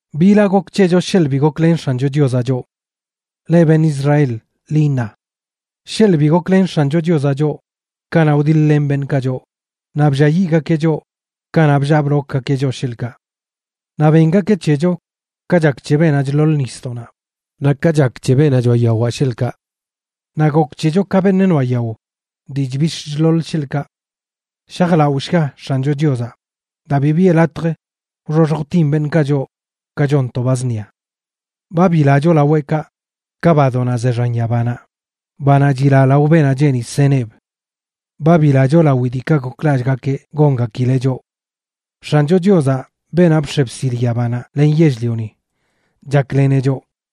¿Bila gok c̱hecho sheḻꞌ bi goklen X̱ancho Chiozaꞌ choꞌ? Leꞌ beṉꞌ Israel, ḻi iṉa: sheḻꞌ bi goklen X̱ancho Chiozaꞌ choꞌ kanaꞌ wdiḻ-len beṉꞌkaꞌ choꞌ, naꞌ blliayiꞌgakeꞌ choꞌ kanaꞌ bllaa blokgakeꞌ choꞌ, sheḻꞌkaꞌ. Naꞌ bengakeꞌ c̱hecho ka chak c̱he beenaꞌ chḻoḻ nisdoꞌnaꞌ, naꞌ ka chak c̱he beenaꞌ choꞌa yawaꞌ, sheḻꞌkaꞌ. Naꞌ gok c̱hecho ka beṉꞌ noaꞌ yao dii chbix̱ chḻoḻ, sheḻꞌkaꞌ. Shajlaꞌoshga X̱ancho Chiozaꞌ, daa bi biꞌe latj wxoxj wtin beṉꞌkaꞌ choꞌ ka chon to ba zṉia. Ba bilacho laweꞌkaꞌ ka badoꞌnaꞌ ze xan yabanaꞌ, banaꞌ chila lao beenaꞌ cheeni seneꞌb. Ba bilacho lawi diikaꞌ goklallꞌgakeꞌ gongakileꞌ choꞌ. X̱ancho Chiozaꞌ, beenaꞌ bx̱e bsil yabanaꞌ len yell-lioni, chakleneꞌ choꞌ.